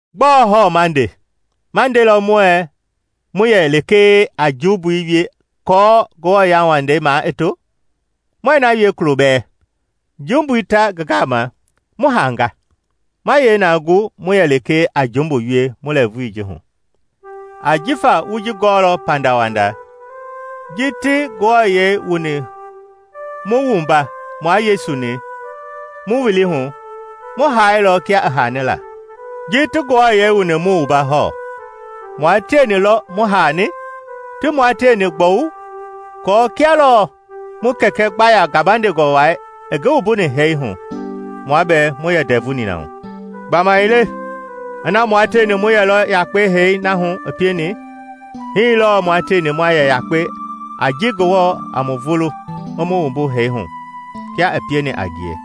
Gbɔɔ hɔɔ naa ma nde? Ma ndelɔ muɛɛ mu yɛ lekee a jumbui wie aako Ngewɔ yauwandei maa i to? Muɛɛ na wie kulo bɛɛ! Jumbui ta ngi gama, mu haanga, ma yee na gu mu yɛ lekee a jumbu wie mu lɛɛvui ji hu? Ajifa wu ji gɔɔlɔ pandawanda: ji ti mu wuani mua Yesu-ni mu wili hu, mu haailɔ kia i haani la. Ji ti mu wuani hɔɔ, mua tieni lɔ mu haani, ti mua tieni gbɔwu aako, kia lɔɔ mu Kɛkɛ gbaya gabandengɔ wai i ngi wumbuni hee hu, mua bɛɛ mu yɛ ndɛvu nina hu. Gbamaile ina mua tieni mu yɛlɔ yakpe hee na hu i pieni, hii lɔɔ mua tieni ma yɛ yakpe a ji Ngewɔ a mu vulu i mu wumbu hee hu kia i pieni a ngie.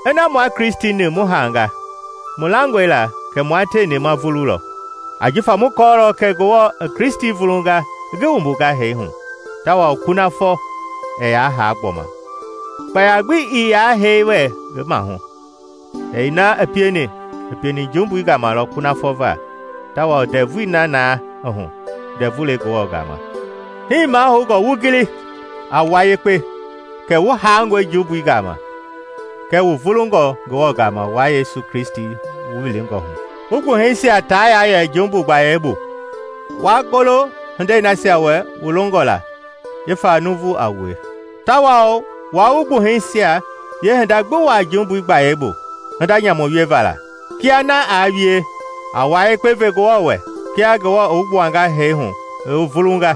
Ina mua Kristi-ni mu haanga, mu langɔe la kɛ mua tieni ma vululɔ. Ajifa mu kɔɔlɔ kɛ Ngewɔ i Kristi vulunga i ngi wumbunga hee hu tawao kunafɔ ɛɛ yaa haa gbɔma kpaya gbi ii yaa hee wɛ ngi maahu. Hee na i pieni, i pieni jumbui gama lɔ kunafɔ va; tawao ndɛvui na naa i hu ndɛvu le Ngewɔ gama. Hii mahoungɔ wu gili a wua yekpe kɛ wu haangɔe jumbui gama, kɛɛ wu vulungɔ Ngewɔ gama wua Yesu Kristi-ni wu wilingɔ hu. Wu gbuhɛisia taa yaa yɛ jumbui gbayei bu, wa golo hindei nasia wɛ wu longɔ la jifa nuuvu a wue. Tawao waa wu gbuhɛisia yeehinda gbi wuaa jumbui gbayei bu hinda nyamu wieva la. Kia na aa wie, a wua yekpe ve Ngewɔ wɛ kia Ngewɔ i wu gbuanga hee hu i wu vulunga,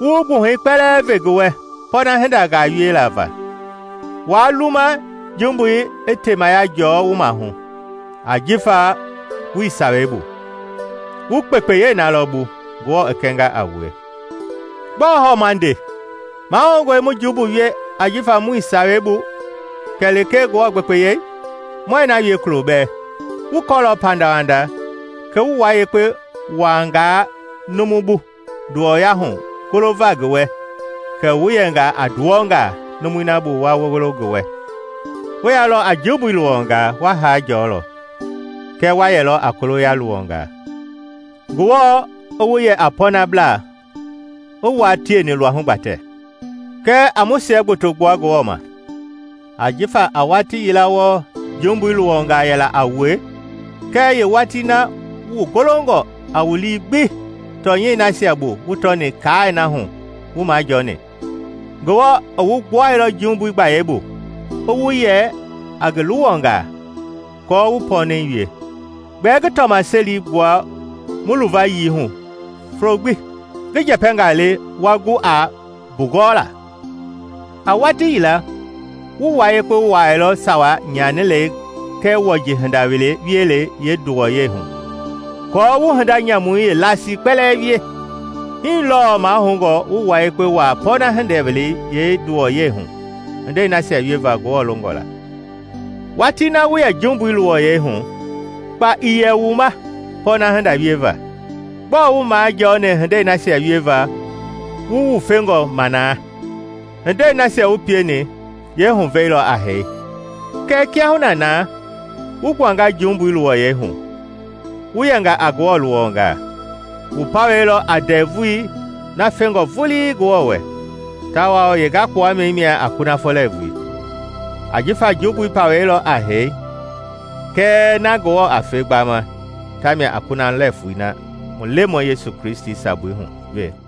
wu wu gbuhɛi kpɛlɛɛ ve ngi wɛ pɔɔna hindangaa wieva la. Waa luma jumbui i temaya jɔɔ wu maahu; ajifa wuii Sawei bu, wu kpekpeyei na lɔ bu Ngewɔ i kɛnga a wue. Gbɔɔ hɔɔ ma nde? Mahoungɔe mu jumbu wie jifa muii Sawei bu kɛ lekee Ngewɔ gbekpeyei? Muɛɛ na wie kulo bɛɛ! Wu kɔɔlɔ pandawanda kɛ wu wua yekpe wuaangaa numu bu nduwɔya hu golova ngi wɛ, kɛ wu yɛnga a nduwɔngaa numui na bu wa golo ngi wɛ -- wuii yɛilɔ a jumbui luwɔngaa, wu hee jɔɔ hu, kɛ wa yɛlɔ a koloya luwɔngaa, Ngewɔ i wu yɛ a pɔɔnablaa i wua tieni luahu gbatɛ. Kɛɛ a mu siɛ gboto gbua Ngewɔ ma! Ajifa a watii yila wɔɔ jumbui luwɔngaa yɛla a wue; kɛɛ yeewatii na wu goloilɔ a wu lii gbi tɔnyɛi nasia bu wu tɔni kaai na hu wu majɔɔni. Ngewɔ i wu gbuailɔ jumbui gbayei bu i wu yɛ a ngi luwɔngaa aako wu pɔɔnɛi wie. Gbɛɛ ngi tɔmaseli gbua mu luvayii hu folo gbi, ngi njɛpɛngaa le wa gu a mbugɔɔla. A watii yila wu wua yekpe wuaailɔ sawa nyanilɛi kɛɛ wɔji hinda wielei yeenduwɔyei hu aako wu hinda nyamui yeelasii kpɛlɛɛ wie. Hii lɔɔ mahoungɔ wu wua yekpe wuaa pɔɔna hinda wielei yeenduwɔyɛi hu hindei nasia wieva Ngewɔ longɔ la. Watii na wu yɛ jumbui luwɔyɛi hu, kpa ii yɛ wu ma pɔɔna hinda wieva. Gbɔɔ wu majɔni hindei nasia wieva wu wufengɔ ma na? Hindei nasia wu pieni yeehuvɛi lɔ a hee! Kɛɛ kiahuna naa wu gbuanga jumbui luwɔyɛi hu, wu yɛnga a Ngewɔ luwɔngaa, wu pawɛi lɔ a ndɛvui na fengɔ vulii Ngewɔ wɛ, tawao yeengakpuami mia a kunafɔ lɛɛvui. Ajifa jumbui pawɛi lɔ a hee; kɛɛ na Ngewɔ a fe gbama ta mia a kunafɔ lɛɛvui a mu Lemɔi Yesu Kristi sabui hu we.